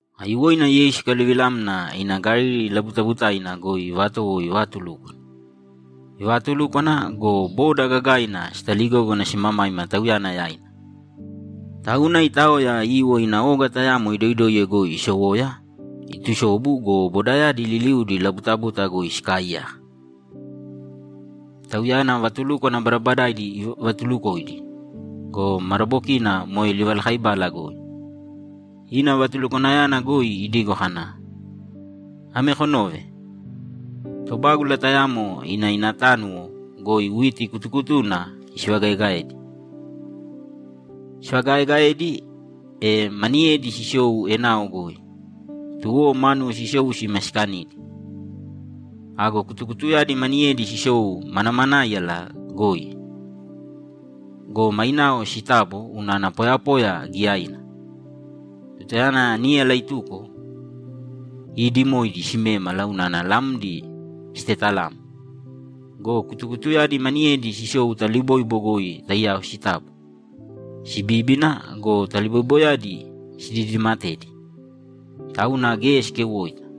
Aiyuwoina Yeisu ikaluvilamna ina Galili labutabutaina goi ivatowo ivatulúkwana. Ivaatulúkwana go, boda gagaina sitaligógana simamaima Tauyana yaina. Tauna itaoya iiwo ina oga tayamo idoidoiye goi isowoya, itusobu go, bodayadi liliudi labutabuta goi sikaaiyaka. Tauyana vatulúkwana badabadaidi ivatuulukoidi go, madabokina moe livalakaibala goi. Ina vatulukwanayana goi idigo kana, ‘Ame konōve: Tobágula tayamo ina ina tánuwo goi witi kutukutuna isivagaegaedi. Isivagaaegaedi, e maniyedi sisou enao goi. Tuwo mánuwo sisou sima sikanidi. Ago kutukutuyadi maniyedi sisou manamanáiyala goi go, mainao sitabo unana poyapoya giyaina. Tutayana níyala ituko, iidimoidi simémala unana lamdi sitetalamo. Go kutukutuyadi maniyedi sisou taliboibo goi taiyao sitabo, sibíbina go, taliboiboyadi sididimatedi, tauna geya sikeuwoita.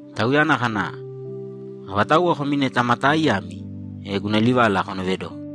Tauyana kana, ‘Avatauwa komi neta ma taaiyami, e guna livala konoovedōko.’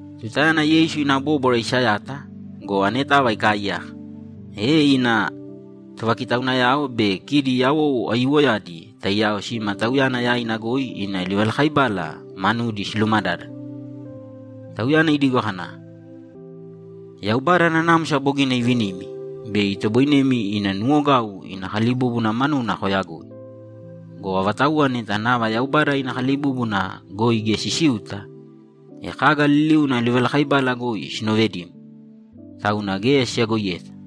Tutayana Yeisu ina bóbwara isayata go, anetava ikaaiyaka, e ina tovakitaunayao be kidi yawou aiyuwoyadi taiyao sima Tauyana yaina goi ina livalakaibala manudi silumadádana. Tauyana idigo kana, ‘Yaubada nanamsa bogina ivinimi bei itoboinemi ina nuwogau ina kalibúbuna manuna koyagoi. Go avatauwa neta nava Yaubada ina kalibúbuna goi geya sisiuta, e kaga liliuna livalakaibala goi sinovedimo, tauna geya siyagoiyeta.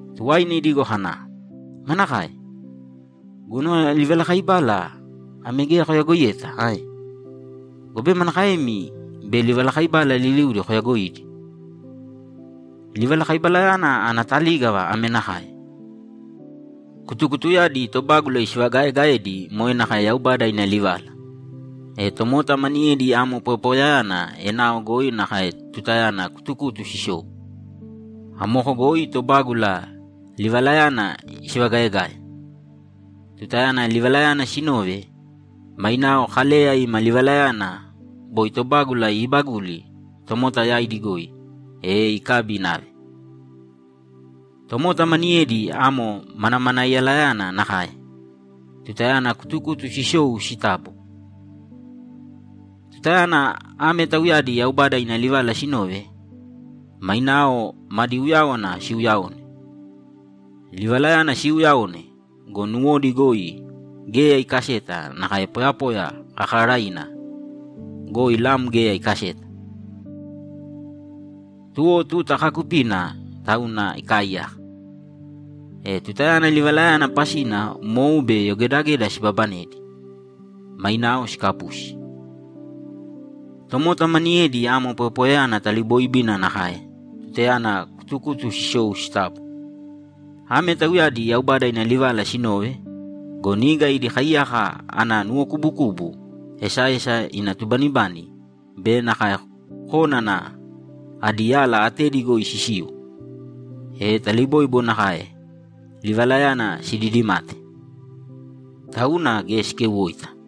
Tuwaina idigo kana, ‘Manakae? Guna livalakaibala ame geya koyagoiyeta ae? Gobe manakaemi bei livalakaibala liliudi koyagoidi? Livalakaibalayana ana talígava ame nakae: Kutukutuyadi tobágula isivagaaegaedi moe nakae Yaubada ina livala. E tomota maniyedi amo poyapoyayana enao goi nakae tutayana kutukutu sisou. Amoko goi tobágula livalayana isivagaegae. Tutayana livalayana sinove, mainao Kaleya ima livalayana boi tobágula iibaguli tomota yaidi goi, e ikabi inave. Tomota maniyedi amo manamanaiyalayana nakae tutayana kutukutu sisou sitabo. Tutayana ame tauyadi Yaubada ina livala sinove, mainao madi uyáwana siuuyaone. Livalayana siuuyaone go, nuwodi goi geya ikaseta nakae poyapoya kakaaraiina goi lam geya ikaseta. Tuwo tuta kaakupina tauna ikaaiyaka. E tutayana livalayana pasina mou be yogedageda sibabanedi, mainao sikapusi. Tomota maniyedi amo poyapoyayana talibooibina nakae tutayana kutukutu sisou sitabo. Ame tauyadi Yaubada ina livala sinove go, niga idi kaiyaka ana nuwokubukubu, esaesa ina tubanibani be nakae kónana adi yala atedi goi sisiu, e taliboibo nakae livalayana sididimate, tauna geya sikeuwoita.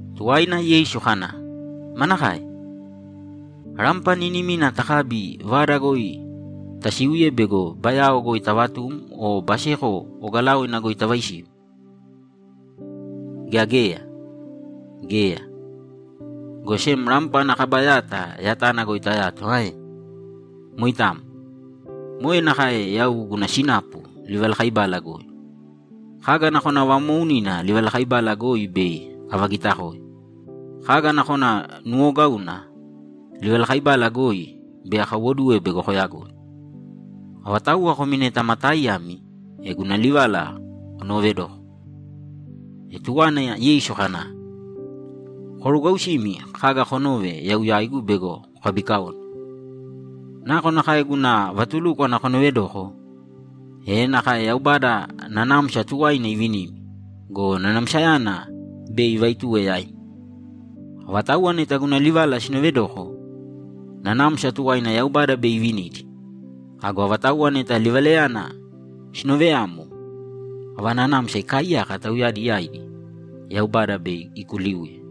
Tuwaina Yeisu kana, ‘Manakae? Rampa niinimina takabi vada goi tasiuye bego bayao goi tavatum o baseko ogalaoina goi tavaisiu, gea geya? Geya, go sem rampa ana kaba yata yatana goi tayato ae? Moitamo. Moe nakae yau guna sinapu livalakaibala goi. Kaga nakona vamoounina livalakaibala goi bei avagitakoe. Kaga nakona nuuwogauna livalakaibala goi bei akaiwoduwe bego koyagoi. Avatauwa komi neta ma taaiyami, e guna livala konoovedōko.’ E tuwaina Yeisu kana, ‘Korugwausīmi kaga konove yau yaigu bego kokabikaone. Nakonakae guna vatulúkwana konovedoko, e nakae Yaubada nanamsa tuwaina ivinimi go, nanamsayana bei ivaituwe yaimi. Avatauwa neta guna livala sinoovedoko, nanamsa tuwaina Yaubada bei ivinidi. Ago avatauwa neta livalayana sinooveyamo, ava nanamsa ikaaiyaka tauyadi yaidi, Yaubada bei ikuliuye.’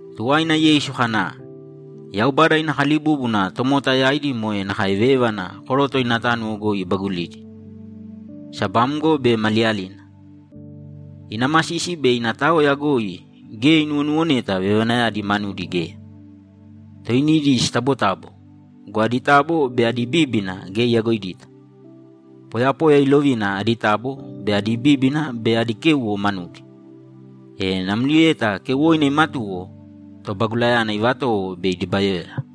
Tuwaina Yeisu kana, ‘Yaubada ina kalibúbuna tomota yaidi moe nakae vévana koroto ina tánuwo goi ibagulidi. Sabamgo be maliyalina, ina masisi be ina taoya goi geya inuwonuwoneta vevanayadi manudi geya. Toinidi sitabotabo go, adi tabo be adi bíbina geya iyagoidita. Poyapoya ilovina adi tabo be adi bíbina be adi kéuwo manudi. E namlieta keuwoina imatuwo, tobagulayana ivatowo bei idibayoya.’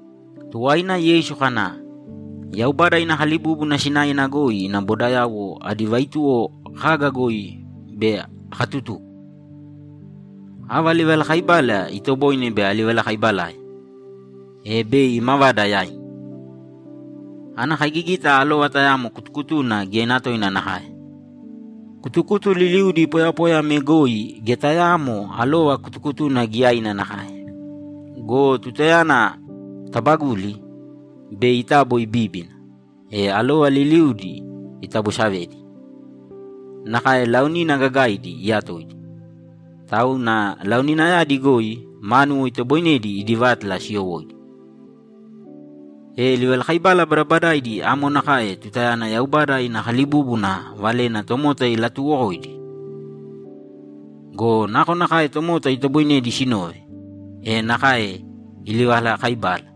Tuwaina Yeisu kana, ‘Yaubada ina kalibúbuna sinaena goi ina bodayauwo adi vaituwo kaga goi bei akatutuko? Ava livalakaibala itoboine bei alivalakaibalae, e bei imavada yaimi? Ana kaigigita alova tayamo kutukutuna giyaina toina nakae. Kutukutu liliudi poyapoya ame goi geya tayaamo alova kutukutuna giyaina nakae. Go tutayana tabaguli, bei itabo ibíbina, e alova liliudi itabosavedi; nakae laonina gagaidi iyatoidi. Tauna laoninayadi goi mánuwo itoboinedi idi vátala siyowóidi.’ E livalakaibala badabadaidi amo nakae tutayana Yaubada ina kalibúbuna valena tomota ilatuuwokoidi. Go nakonakae tomota itoboinedi sinove, e nakae ilivalaakaibale.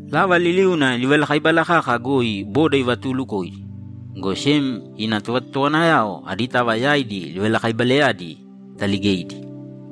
Lava liliuna livalakaibala kaka goi boda ivatuulukoidi, go sem ina tovatotowanayao aditava yaidi livalakaibalayadi itaaligeidi.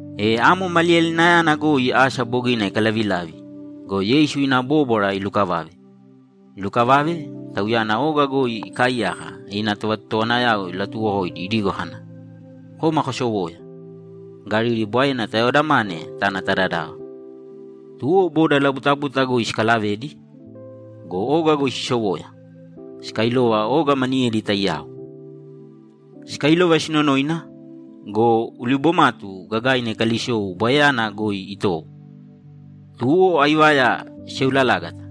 E amo maliyalinayana goi asa bogina ikalavilavi go, Yeisu ina bóbwara ilukavave. Ilukavave, Tauyana oga goi ikaaiyaka ina tovatotowanayao ilatuwokoidi idigo kana, ‘Kōma kosowōya, Galili Bwaena tayaodamāne tāna ta dadava.’ Tuwo boda labutabuta goi sikalavedi go, oga goi sisowoya, sikailova oga maniyedi taiyao. Sikailova sinonoina go, ulibomatu gagaina ikalisou Bwaeyana goi itowo. Tuwo aivaya siseulalágata,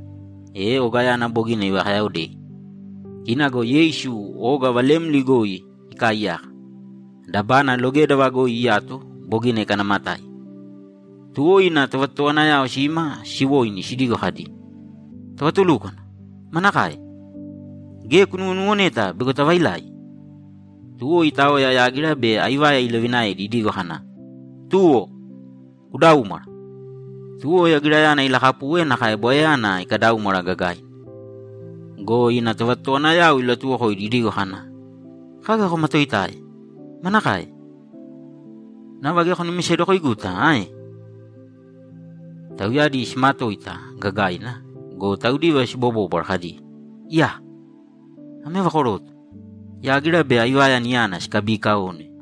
e ogayana bogina sivakayaaodei. Kina go Yeisu oga valemli goi ikaaiyaka, dabana logédava goi iyato bogina ikanaamatáiya. Tuwo ina tovatotowanayao sima siwoini sidigo kadi, ‘Tovatulúkwana! Manakae? Geya kunuwonuwoneta bego tavailai?’ Tuwo itaoya yágira be aivaya ilovinaedi idigo kana, ‘Tuwo! Kudaūmwara!’ Tuwo yagirayana ilakapuwe nakae Bwaeyana ikadaúmwara gagaina. Go ina tovatotowanayao ilatuwokoidi idigo kana, ‘Kaga komatoitae? Manakae? Nava geya konumisedokoiguta ae?’ Tauyadi simatoita gagaina go, taudiva sibobóbwara kadi, ‘Iyaa! Ame ava koroto? Yágira be aivaya niyana sikabiikaone?’